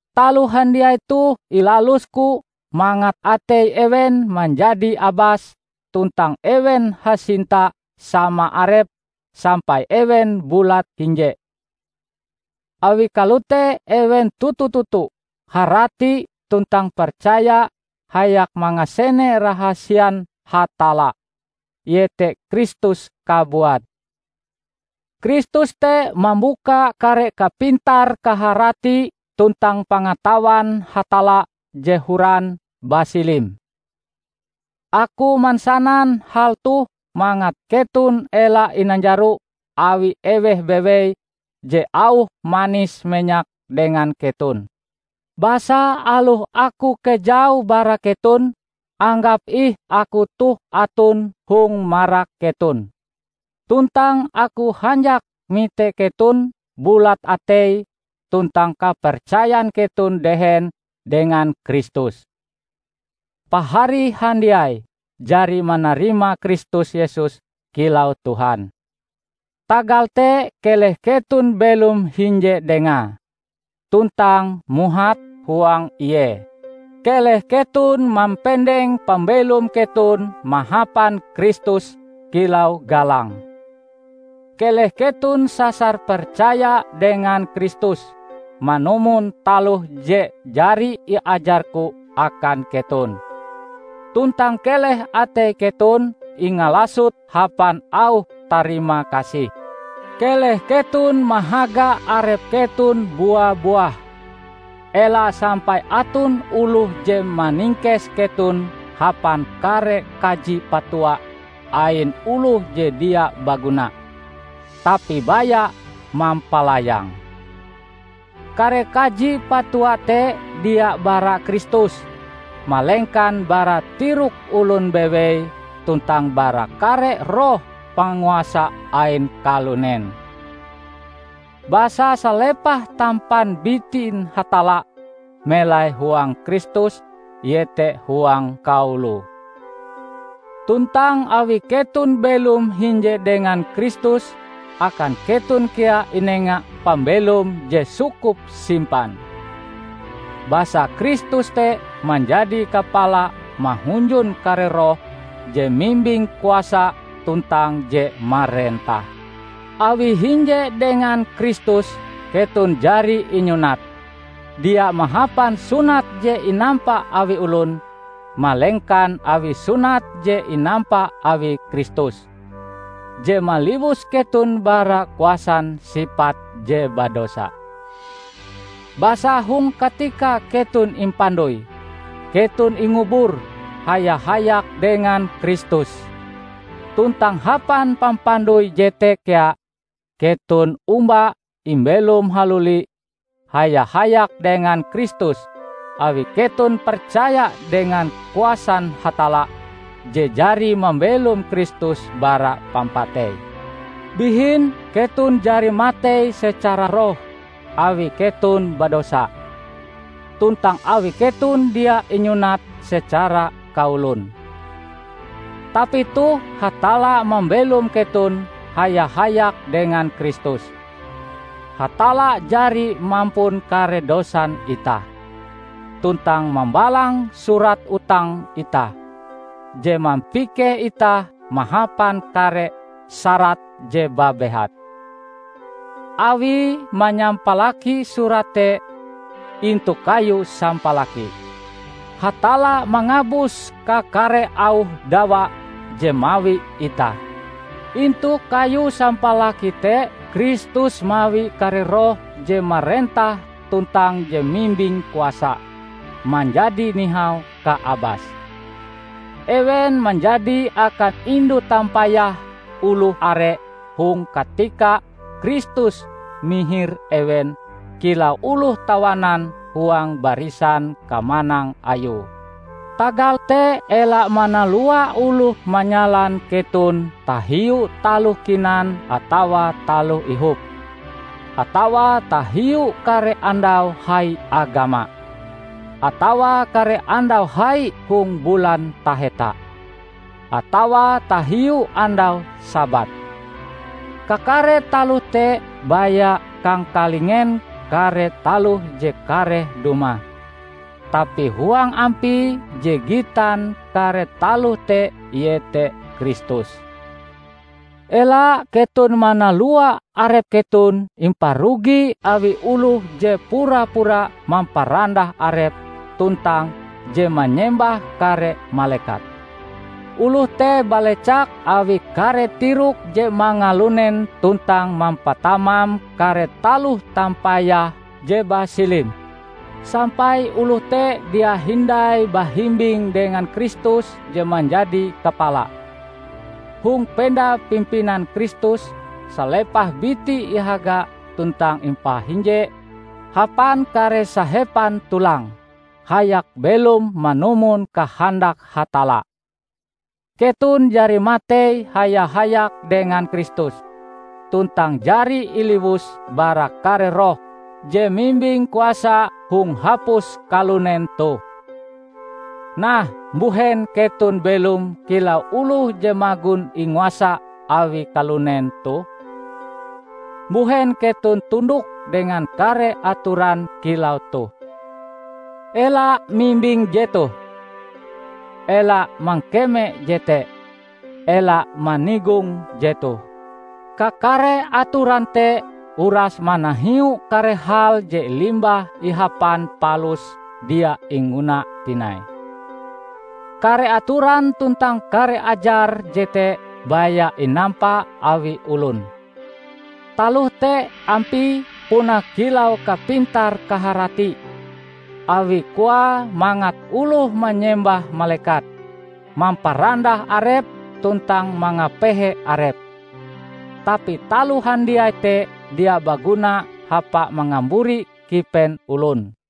Taloh handiai toh ilalusku mangat atei ewen manjadi abas tuntang ewen hasinta sama arepe sampai ewen bulat hinje. Awi kalote ewen toto-toto harati tuntang percaya hayak mangasene rahasian Hatalla, iete Kristus kabuat. Kristus te mambuka kare kapintar-kaharati tuntang pangatawan Hatalla je horan basilim. Aku mansanan hal toh mangat keton ela inanjaro awi eweh bewei je auhe manis-menyak dengan keton. Basa aloh aku kejau bara keton, anggap ih aku toh aton hong marak keton. Tuntang aku hanjak mite keton bulat atei tuntang kapercayan keton dehen dengan Kristus. Pahari handiai jari manarima Kristus Yesus kilau Tuhan. Tagal te keleh keton belom hinje Dengae, tuntang muhat huang Ie. Keleh keton mampendeng pambelom keton mahapan Kristus kilau galange. Keleh keton sasar percaya dengan Kristus, manumon taloh je jari iajarku akan keton. Tuntang keleh atei keton ingalasot hapan auh tarimakasih. Keleh keton mahaga arep keton bua-buah, ela sampai aton oloh je maningkes keton hapan kare kaji-patua ain oloh je dia baguna, tapi baya mampalayang. Kare kaji-patua te dia bara Kristus, malengkan bara tirok olon bewei tuntang bara kare roh panguasa ain kalunen. Basa salepah tampan bitin Hatalla melai huang Kristus, iete huang kaoloe. Tuntang awi keton belom hinje dengan Kristus, akan keton kea inenga pambelom je sukup-simpan. Basa Kristus te manjadi Kapala mahunjun kare roh je mimbing kuasa tuntang je marentah. Awi hinje dengan Kristus, keton jari inyunat, dia mahapan sunat je inampa awi olon, malengkan awi sunat je inampa awi Kristus, je maliwus keton bara kuasan sipat je badosa. Basa hong katika keton impandoi, keton ingubur haya-hayak dengan Kristus; tuntang hapan pampandoi jete kea, keton omba imbelom haluli haya-hayak dengan Kristus awi keton percaya dengan kuasan Hatalla je jari mambelom Kristus bara pampatei. Bihin, keton jari matei secara roh awi keton badosa, tuntang awi keton dia inyunat secara kaolon. Tapi toh Hatalla mambelom keton haya-hayak dengan Kristus. Hatalla jari mampun kare dosan itah, tuntang mambalang surat utang itah, je mampikeh itah mahapan kare syarat je babehat. Awie manyampalaki surat te intu kayu sampalaki, Hatalla mangabus kakare auh dawa je mawi itah. Intu kayu sampalaki te Kristus mawi kare roh je marentah tuntang je mimbing kuasa, manjadi nihau kaabase. Ewen manjadi akan indu tampayah oloh are hong katika Kristus mihir ewen kilau oloh tawanan huang barisan kamanang Ayue. Tagal te ela manalua oloh manyalan keton tahiu taloh kinan atawa taloh ihop, atawa tahiu kare andau hai agama, atawa kare andau hai hong bulan taheta, atawa tahiu andau Sabat. Kakare taloh te baya kangkalingen kare taloh je kareh dumah, tapi huang ampie je gitan kare taloh te iete Kristus! Ela keton manalua arep keton imparugi awi oloh je pura-pura mamparandah arepe tuntang je manyembah kare malekat. Oloh te balecak awi kare tirok je mangalunen tuntang mampatamam kare taloh tampayahe je basilim, sampai oloh te dia hindai bahimbing dengan Kristus je manjadi kapala. Hong penda pimpinan Kristus, salepah biti ihaga tuntang impahinje hapan kare sahepan tulange, hayak belom manumon kahandak Hatalla. Keton jari matei haya-hayak dengan Kristus, tuntang jari iliwus bara kare roh je mimbing kuasa hong hapus kalunen toh. Nah mbuhen keton belom kilau oloh je magon inguasa awi kalunen toh? Mbuhen keton tundok dengan kare atoran kilau toh, "Ela mimbing jetoh", "Ela mangkeme jete", "Ela manigong jetoh"? Kakare atoran te uras manahiu kare hal je limbah ihapan palus dia ingguna tinai. Kare atoran tuntang kare ajar jete baya inampa awi olon. Taloh te, ampie puna kilau kapintar-kaharati, awi koae mangat oloh manyembah malekat, mamparandah arep tuntang mangapehe arep; tapi taloh handiai te dia baguna hapa mangamburi kipen olon.